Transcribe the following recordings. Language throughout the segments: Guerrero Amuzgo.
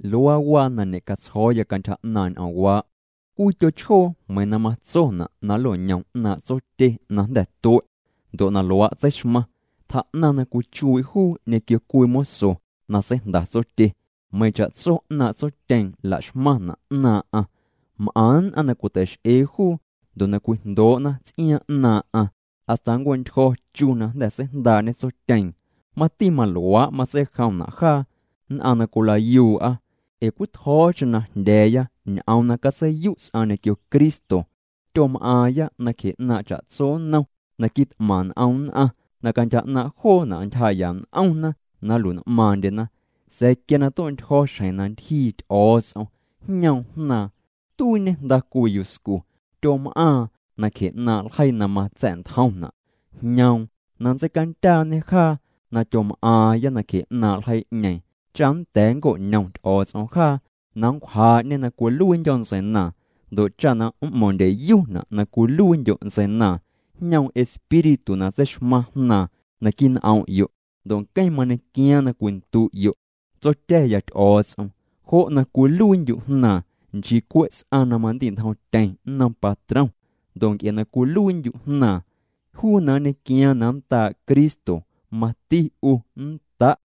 Luaa waa na ñe'catsjo̱o̱ya cantyja 'naaⁿ' ñ'oomwaa': Cwii tyochjoo meiiⁿ na matsona' na nlo'ñom 'naaⁿ' tsotye na jnda̱ tue', ndo' na luaa' tseixmaⁿ, tjaa'naⁿ na cwichuii' juu ñequio cwii moso na seijnda tsotye, meiiⁿ cha'tso 'naaⁿ' tsotyeeⁿ la'xmaⁿna' 'naaⁿ'aⁿ. M'aⁿ nn'aⁿ na cwiteix'ee juu, ndo' na cwijndoo'na ts'iaaⁿ 'naaⁿ'aⁿ hasta nncue'ntyjo̱ chu na jnda̱ seijndaa'ñe tsotyeeⁿ. Mati maluaa' matseijomna' jaa nn'aⁿ na cwila'yuu'a. Ee cwii tjo̱o̱cheⁿ na jndya̱a̱ya ñ'oom na catseiyu' ts'aⁿ ñequio Cristo, tyom'aaⁿya nacje 'naaⁿ cha'tso nnom na quit'maⁿ n'om nn'aⁿ na cantyja 'naaⁿ joona' ntyjaa'ya n'omna na nlui'n'maaⁿndyena. Sa̱a̱ quia na tue'tyjo̱ xjeⁿ na ntyjii Ty'o̱o̱ts'om, jñoom Jnaaⁿ. Tuiiñe jnda cwii yuscu. Tyom'aaⁿ nacjee 'naaⁿ' ljeii na matsa̱'ntjomna'. Jñoom na nntseicandyaañê jaa na tyom'aaⁿya nacje 'naaⁿ' ljeii'ñeeⁿ, cha nda̱a̱ nnco'ñom Ty'o̱o̱ts'om jaa na nncwjaa'ñê na cwiluiindyo̱ ntseinaaⁿ. Ndo' cha na m'mo̱ⁿndyeyuna' na cwiluiindyo' ntseinaaⁿ jñoom Espíritu na tseixmaⁿ Jnaaⁿ naquii' n'om'yo' ndo' nqueⁿ mañequiaaⁿ na cwindu'yo': “Tsotya̱ya Ty'o̱o̱ts'om.” Jo' na cwiluiindyu' jnaaⁿ, nchii cwe' ts'aⁿ na mandi'ntjomtyeⁿ nnom patrom. Ndo' nc'e na cwiluiindyu' jnaaⁿ, juu na nñequiaaⁿ na nndaa' Cristo, mati 'u nnda'.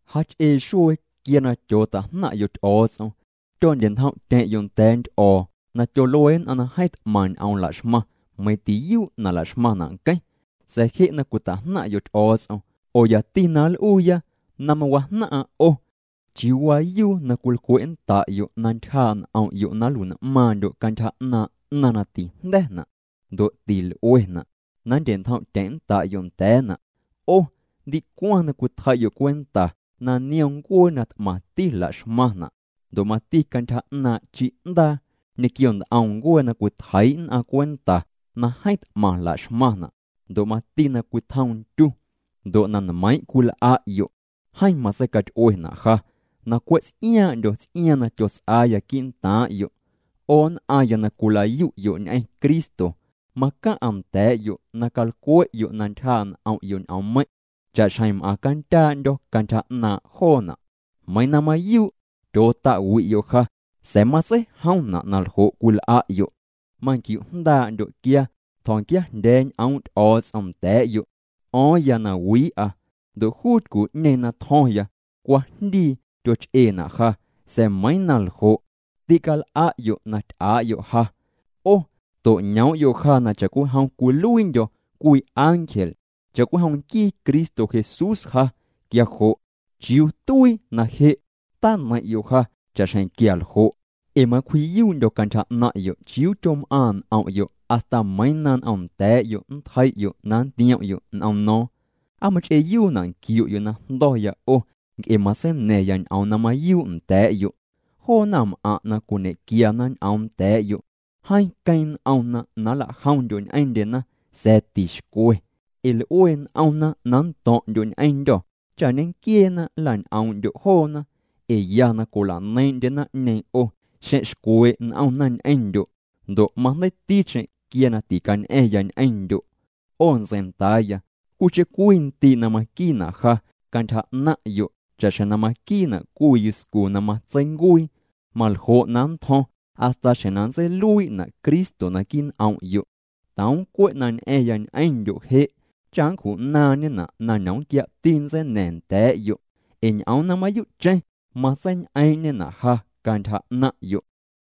Jach'ee xuee quia na tyoota'jnaⁿ'yo' Ty'o̱o̱ts'om, tyondye'ntjom'tyeⁿ'yo' nda̱a̱ nty'o̱o̱n'om na tyolue nn'aⁿ na jeeⁿ t'maⁿ ñ'oom la'xmaⁿ, meiiⁿ tiyuu' na la'xmaⁿna' nqueⁿ. Sa̱a̱ je' na cwita'jnaⁿ'yo' Ty'o̱o̱ts'om, oo yati na nl'uuya na mawajnaⁿ'aⁿ 'o, ¿chiuu waayu na cwilcwe'nnda'yo' na ntyjaa' n'om'yo' na nlui'n'maaⁿndyo' cantyja 'naaⁿ' 'naⁿ na tijnda̱na' ndo' til'uena', na nndye'ntjom'tyeⁿ'nnda'yo' nda̱a̱na'? 'O ndicwaⁿ na cwitjei'yo' cwenta na niom ncuee na t'mati laxmaⁿna', ndo' mati cantyja 'naaⁿ' chi'ndaa ñequio nt'om ncuee na cwitjeii' nn'aⁿ cwenta na jeeⁿ t'maⁿ la'xmaⁿna', ndo' mati na cwitjom ndyu. Ndo' na nmeiiⁿ' cwil'a'yo', jeeⁿ matseicaty'uena' ja na cwe' ts'iaaⁿ'ndyo ts'iaaⁿ na tyots'aaya quii'ntaaⁿ'yo'. 'O nn'aⁿya na cwila'yu'yo' ñ'eⁿ Cristo, macaⁿ'a nda̱a̱'yo' na calcwe'yo' na ntyjaa' n'om'yo' ñ'oommeiⁿ' cha'xjeⁿ m'aaⁿ candyaandyo̱ cantyja 'naaⁿ' joona'. Meiiⁿ na mayuu' tyoota'wi'yo' ja sa̱a̱ matseijomna' na ljo' cwil'a'yo'. Manquiujndaa'ndyo' quia tjo̱nquiajndya̱a̱ ñ'oom' Ty'o̱o̱ts'om nda̱a̱'yo', t'o̱o̱ⁿya na wii'a. Ndo' juu tycu'ñeeⁿ na tjo̱ⁿya, cwajndii tyoch'eena' ja, sa̱a̱ meiiⁿ na ljo', tîcal'a'yo' na ty'aa'yo' ja. 'O to'ñoom'yo' ja na cha'cwijom cwiluiindyo̱ cwii ángel, cha'cwijom nquii Cristo Jesús ja. Quia jo' ¿chiuu tuii na je' taneiⁿ'yo' ja cha'xjeⁿ quialjo'? Ee macwji'yuu'ndyo̱ cantyja 'naⁿ'yo' chiuu tyom'aaⁿ' n'om'yo', hasta meiiⁿ na n'omnda̱a̱'yo' nntjei'yo' na nntiom'yo' n'om no̱o̱ⁿ. ¿Aa mach'eeyuuna' nquiu'yo' na jndo̱ya 'o nc'e matseina̱ⁿya ñ'oom na mayuu' nda̱a̱'yo'? Joo naⁿm'aⁿ' na cwiñequiana ñ'oom nda̱a̱'yo', jeeⁿ queeⁿ n'omna na nla'jomndyo' ñ'eⁿndyena, sa̱a̱ tixcwe ee l'ue n'omna na nto̱ⁿ'ndyo' ñ'eⁿndyô̱ cha ñenquieena nla'ñ'oom'ndyo' joona. Ee ya na cwila'neiiⁿ'ndye naⁿ'ñeeⁿ 'o, xeⁿ xcwee' n'omna ñ'eⁿndyo'. Ndo' majndeiiticheⁿ quia na ticañ'a̱ⁿya ñ'eⁿndyo'. 'O ntseindaaya cwiicheⁿ cwiindii' na maquiina' ja cantyja 'naⁿ'yo' cha'xjeⁿ na maquiina' cwii yuscu na matseincuii, maljo' na nntjo̱ⁿ hasta xjeⁿ na nntseiluii'na' Cristo naquii' n'om'yo'. Toom cwe' na ñ'a̱ⁿya ñ'eⁿndyo' je' cha' nncju'naaⁿñena' na ñomquia'ti nntseina̱ⁿ nda̱a̱'yo', ee ñ'oom na mayuu'cheⁿ matseiñ'eeⁿ'ñena' ja cantyja 'naⁿ'yo'.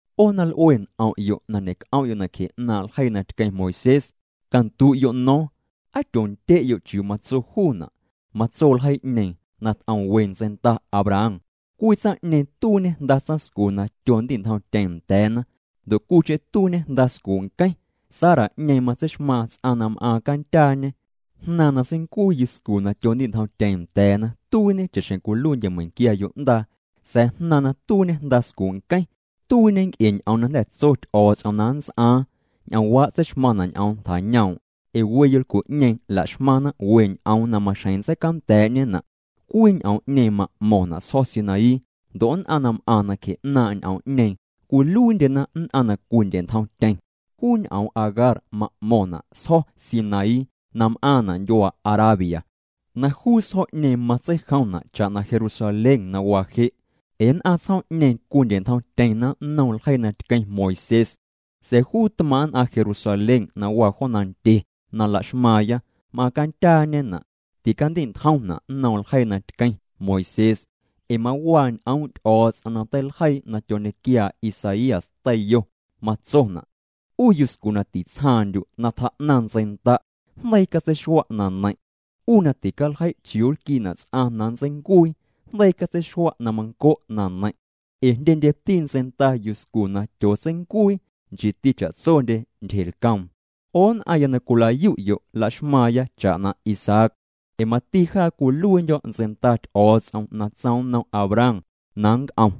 'O na l'ue n'om'yo' na ñe'c'om'yo' na cje 'naaⁿ' ljeii na tqueⁿ Moisés, candu'yo' no̱o̱ⁿ: ¿Aa tyoondye'yo' chiuu matso juuna'? Matso ljeii'ñeeⁿ na t'om we ntseinda Abraham. Cwii tsaⁿ'ñeeⁿ tuiiñe jnda tsaⁿscu na tyondi'ntjomtyeⁿ nda̱a̱na, ndo' cwiicheⁿ tuiiñe jnda scuu' nqueⁿ, Sara'ñeeⁿ titseixmaaⁿ ts'aⁿ na m'aaⁿ candyaañe. Jnaaⁿ na seincuii yuscu na tyondi'ntjomtyeⁿ nda̱a̱na, tuiiñe cha'xjeⁿ cwiluiindye meiⁿnquia yo'ndaa, sa̱a̱ jnaaⁿ na tuiiñe jnda scuu' nqueⁿ, tuiiñe nc'e ñ'oom na jnda̱ tso Ty'o̱o̱ts'om na nnts'aaⁿ. Ñ'oomwaa' tseixmaⁿna' ñ'oom tjañoom'. Ee we yolcu'ñeeⁿ la'xmaⁿna we ñ'oom na maxjeⁿ ntseicanda̱a̱'ñena'. Cwii ñ'oom'ñeeⁿ ma'mo̱ⁿna' Sjo̱ Sinaí, ndo' nn'aⁿ na m'aⁿ nacje'naaⁿ' ñ'oom'ñeeⁿ cwiluiindyena nn'aⁿ na cwindye'ntjomtyeⁿ. Juu ñ'oom Agar ma'mo̱ⁿna' sjo̱ Sinaí na m'aaⁿna' ndyuaa Arabia, na juu sjo̱'ñeeⁿ matseijomna' cha'na Jerusalén na waa je', ee nn'aⁿ tsjoom'ñeeⁿ cwindye'ntjomtyeⁿna nnom ljeii na tqueⁿ Moisés. Sa̱a̱ juu tmaaⁿ' nn'aⁿ Jerusalén na waa jo nandye na la'xmaaⁿya, m'aaⁿ candyaañena', ticandi'ntjomna' nnom ljeii na tqueⁿ Moisés. Ee mawaa ñ'oom' Ty'o̱o̱ts'om na teiljeiina' na tyoñequiaa Isaías teiyo. Matsona': 'U yuscu na titsjaaⁿndyu' na tjaa'naⁿ ntseinda', jndeii catseixua' na neiⁿ', 'u na ticaljei' chiuu nlquiina' ts'aⁿ na nntseincuii, jndeii catseixua' na manco' na neiⁿ', ee jndyendyeti ntseinda yuscu na tyootseincuii nchiiti cha'tsondye tyjelcoom. 'O nn'aⁿya na cwila'yu'yo', la'xmaaⁿya cha'na Isaac, ee mati jaa cwiluiindyo̱ ntseinda Ty'o̱o̱ts'om na tsoom nnom Abraham na nc'om.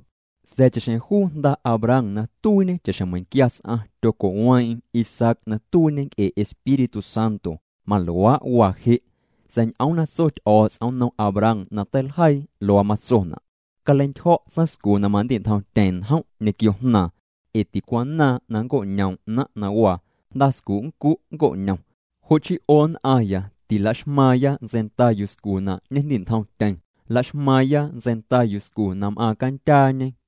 Sa̱a̱ cha'xjeⁿ juu jnda Abraham na tuiiñe cha'xjeⁿ meiⁿquia ts'aⁿ, tyoco'weeⁿ'eⁿ Isaac na tuiiñe nc'e Espíritu Santo, maluaa' waa je'. Sa̱a̱ ñ'oom na tso Ty'o̱o̱ts'om nnom Abraham na teiljeii, luaa matsona': “Caleintyjo̱' tsaⁿscu na mandi'ntjomtyeⁿ njom' ñequio jnaaⁿ, ee ticwanaaⁿ na nnco'ñoom 'naⁿ' na waa, jnda scu' nncu' nnco'ñom.” Jo' chii 'o nn'aⁿya, tila'xmaaⁿya ntseinda yuscu na ñejndi'ntjomtyeⁿ. Laxmaaⁿya ntseinda yuscu na m'aaⁿ candyaañe.